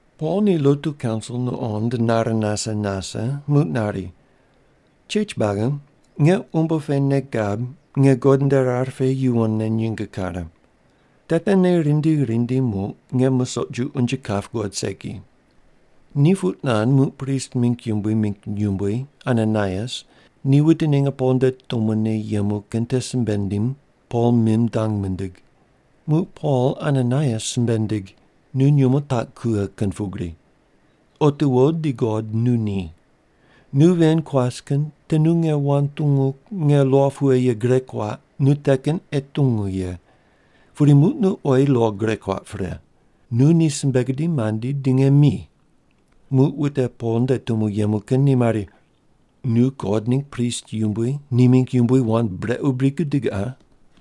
Pol ni lotu kaunsil nuqond nare nase nase, muq nari, “Chech buagi, nge umbo pe nei gab nge God nde rar pe yuwonne nyinge kare. Te tene rindi rindi muq, nge musoq ju unje kap guqod segi.” Ni puq nand, muq prist mingg yumbui mingg yumbui Ananaias ni wute ninge Pol nde tumone yemu kin te simbe nindim Pol mim dang mindig. Muq Pol Ananaias simbe nindig, “Nu nyumo taq kughe kin pugri! Otiwo di God nu ni. Nu ven kuas kin te nu nge wand tungu nge lo pughe ye gure kuaq nu te kin ei tungu ye, pudi muq nu oyi lo gure kuaq pre. Nu ni simbe gudim mandi di nge mi!” Muq wute Pol nde tumo yemu kin te mari, “Nu God ningg prist yumbui ni mingg yumbui wand brequ bri gudig qa?”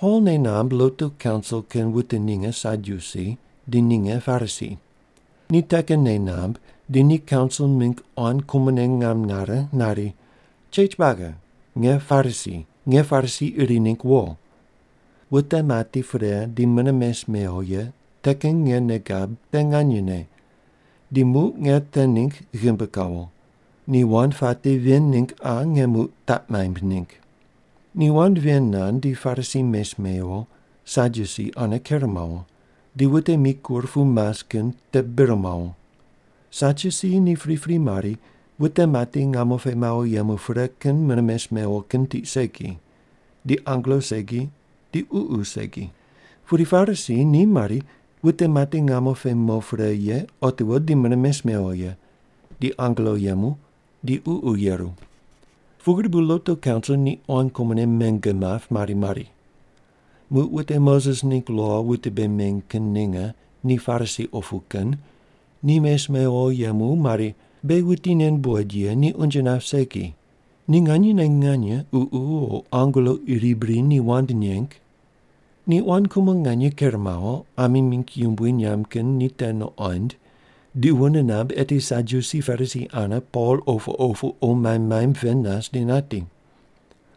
Pol nei namb lotu kaunsil kin wute ninge Sadyusi, di ninge Parisi. Ni te kin nei namb di ni kaunsil mingg quan kumone ngam nare nari, “Chech buagi, nge Parisi, nge Parisi iri ningg wo. Wute mati pre di mune mes mewo ye te kin nge nei gab te nganyene, di muq nge te ningg ghimbi kawo. Ni wand puate ven ningg qa nge muq taq maimb ningg.” Ni wand ven nand, di Parisi mes mewo, Sadyusi ane ker mawo, di wute mikur pu mas kin te bir mawo. Sadyusi ni pripri mari wute mati ngamo pe mawo yemu pre kin mune mes mewo kin tiq segi, di angelo segi, di ququ segi. Pudi Parisi ni mari wute mati ngamo pe mo pre ye otiwo di mune mes mewo ye, di angelo yemu, di ququ yeru. Pugri bu lotu kaunsil ni quan kumone menge map mari mari. Muq wute Moses ningg lo wute bei meny kin ninge ni Parisi opu kin ni mes mewo yemu, mari, “Beghi wuti nen buqoid ye ni unje nap segi. Ni nganyene nganye ququ o angelo iri bri ni wand neng?” Ni quan kumo nganye ker mawo, ami mingg yumbui nyamb kin ni te nuqond di wune namb eti Sadyusi Parisi ane Pol opu opu qo maimb maimb pend nas di nati.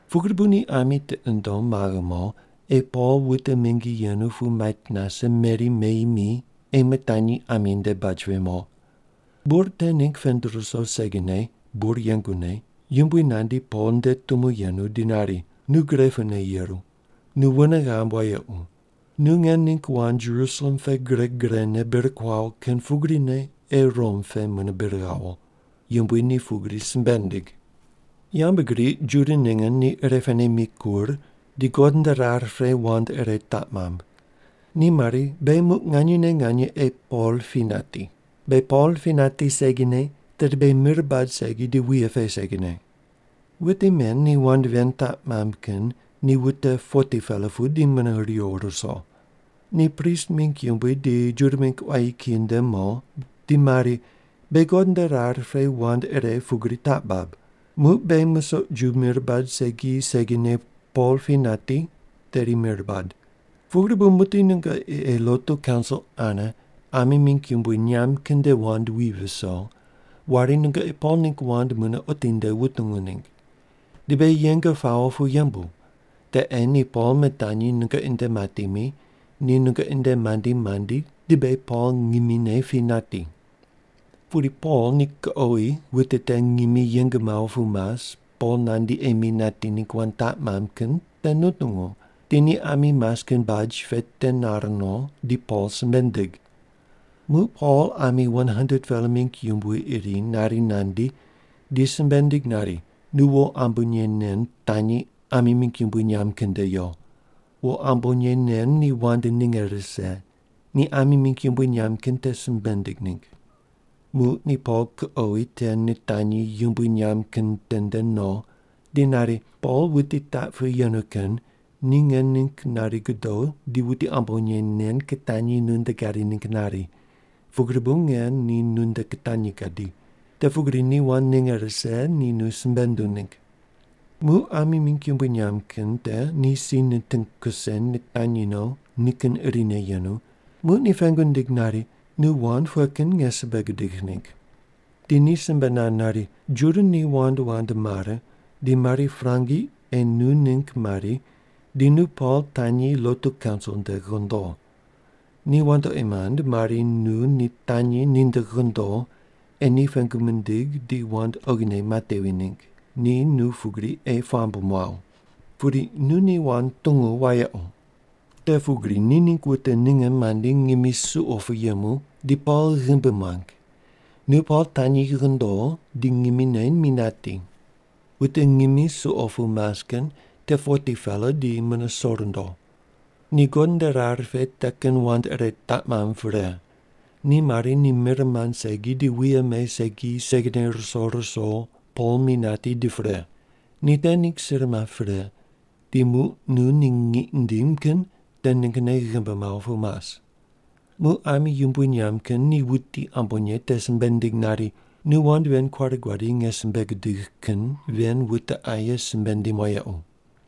Pugri bu ni ami tiqi nundom maghe mo, ei Pol wute mingi yenu pu mait nase meri meyi mi ei mitanyi ami nde baj pe mo. Bur te ningg pend ruso segine bur yengune Yumbui nandi Pol nde tumo yenu di nari, “Nu gre pune yeru. Nu wune ghamb wayequ. Nu nge ningg wand Jerusalem pe gre grene bir kuawo kin pugrine ei Rom pe mune bir ghawo.” Yumbui ni pugri simbe nindig. Yambgriq Juda ninge ni irepene mikur, di God nde rar pe wand ire taq mamb. Ni mari, “Beghi muq nganyene nganye ei Pol pi nati. Beghi Pol pi nati segine, tedi beghi mir bad segi di wuye pe segine.” Wute men ni wand ven taq mamb kin ni wute 40-pela pu di mune riwo ruso. Ni prist mingg yumbui di Juda mingg quayi kiyi nde mo di mari, “Beghi God nde rar pe wand ire pugri taq bab: Muq beghi musoq ju mir bad segi segine Pol pi nati, tedi mir bad. Pugri bu muqdi nungoqi ei lotu kaunsil ane ami mingg yumbui nyamb kin nde wand wi viso, wari nungoqi Pol ningg wand mune otinde wutungu ningg. Di beghi yeng pawo pu yembu. Te ei ni Pol mitanyi nungoqi nde mati mi, ni nungoqi nde mandi mandi di beghi Pol ngimine pi nati.” Pudi Pol ni kuqowi wute te ngimi yeng mawo pu mas Pol nandi ei mi nati ningg wand taq mamb kin te nutungu, di ni ami mas kin baj pe te nar no di Pol simbe nindig. Muq Pol ami 100-pela mingg yumbui iri nari nandi di simbe nindig nari, “Nu wo ambonye nen tanyi ami mingg yumbui nyamb kin nde yo. Wo ambonye nen ni wand ninge rise, ni ami mingg yumbui nyamb kin te simbe ninding ningg.” Muq ni Pol kuqowi te nitanyi yumbui nyamb kin tende no di nari, “Pol wuti taq pu yenu kin te nge ningg nari godo di wuti ambonye nen kitanyi nunde gadi ningg nari, pugri bu nge ni nunde kitanyi gadi. Te pugri ni wand ninge rise ni nu simbe nunduw ningg.” Muq ami mingg yumbui nyamb kin te ni si niting kuse nitanyi no nikin irine yenu, muq ni pengu nindig nari, “Nu wand pughe kin nge simbe gudigh ningg?” Di ni simbe nand nari, “Juda ni wand wand mare di mari prangi ei nu ningg mari di nu Pol tanyi lotu kaunsil nde ghondo. Ni wandoqi mand mari nu ni tanyi ninde ghondo ei ni pengu mindig di wand oghine matevi ningg, ni nu pugri ei puamb muaw. Pudi nu ni wand tungu wayequ. Te pugri ni ningg wute ninge mandi ngimi suqo pu yemu di Pol ghimbi muang, nu Pol tanyi ghondo di ngimine mi nati. Wute ngimi suqo pu mas kin te 40-pela di mune so rundo. Ni God nde rar pe te kin wand ire taq mamb pre, ni mari ni mir mand segi di wuye me segi segine ruso ruso Pol mi nati di pre. Ni te ningg sir map pre, di muq nu ni ngiq ndim kin te ninggne ghimbi mawo pu mas.” Muq ami yumbui nyamb kin te wuti ambonye te simbe nindig nari, “Nu wand ven kuare guadi nge simbe gudigh kin ven wute aye simbe ndim wayequ.”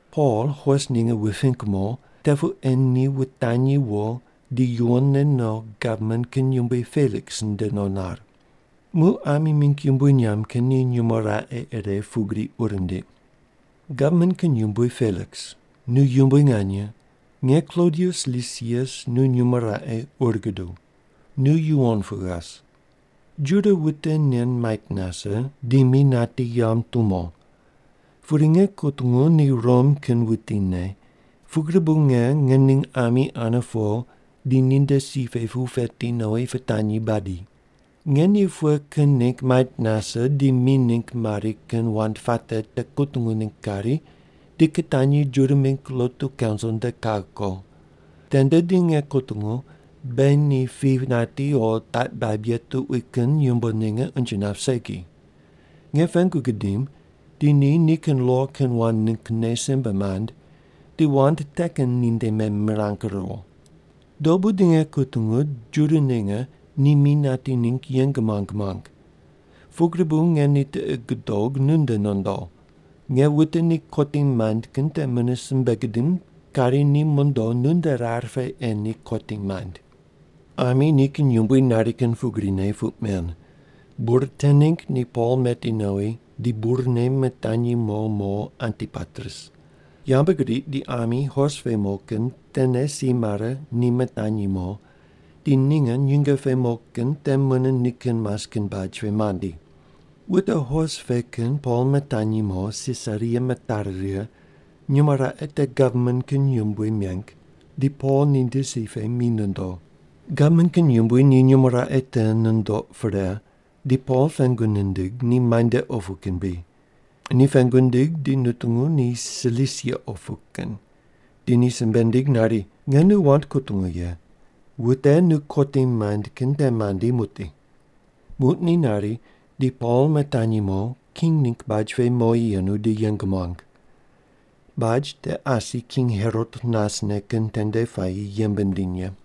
Pol hos ninge wuping mo, te pu ei ni wutanyi wo di yuwonne no gavman kin yumbui Peliks nde no nar.” Muq ami mingg yumbui nyamb kin ni nyumo raqe ire pugri ur nindiq: “Gavman kin yumbui Peliks, nu yumbui nganye, nge Klodius Lisias nu nyumo raqe ur guduw. Nu yuwon pu ghas. Juda wuti nen mait nase di mi nati yamb tumo. Pudi nge kutungu ni Rom kin wutine, pugri bu nge nge ning ami ane po di ninde si pe pu peti nowi pitanyi badi. Nge ni pughe kin ningg mait nase di mi ningg mari kin wand puate te kutungu ningg kari di kitanyi Juda mingg lotu kaunsil nde kaghe ko. Tende di nge kutungu, beghi ni pi nati o taq baib ye tuqui kin yumbo ninge unje nap segi. Nge pengu gidim di ni nikin lo kin wand ninggne simbe mand, di wand te kin ninde memirang riwo. Dobu di nge kutungu Juda ninge ni mi nati ningg yeng muang muang, pugri bu nge ni tiqi gudog nunde nondo. Nge wute ni kotim maind kin te mune simbe gidim kari ni mondo nunde rar pe ei ni kotim maind.” Ami nikin yumbui nari kin pugrine puq men. Bur te ningg ni Pol meti nowi di burne mitanyi mo mo Antipatris. Yambgriq di ami hos pe mo kin tene si mare ni mitanyi mo di ninge nyinge pe mo kin te mune nikin mas kin baj pe mandi. Wute hos pe kin Pol mitanyi mo Sisaria mitari righe, nyumo raqe te gavman kin yumbui meng, di Pol ninde si pe mi nondo. Gavman kin yumbui ni nyumo raqe te nundoq pre di Pol pengu nindig ni muainde opu kin bri. Ni pengu nindig di nutungu ni Silisia opu kin, di ni simbe nindig nari, “Nge nu wand kutungu ye, wute nu kotim maind kin te mandi muqdi.” Muq ni nari di Pol mitanyi mo king ningg baj pe mowi yenu di yeng muang. Baj te asi King Herot nasne kin tende puayi yembe nindiny ye.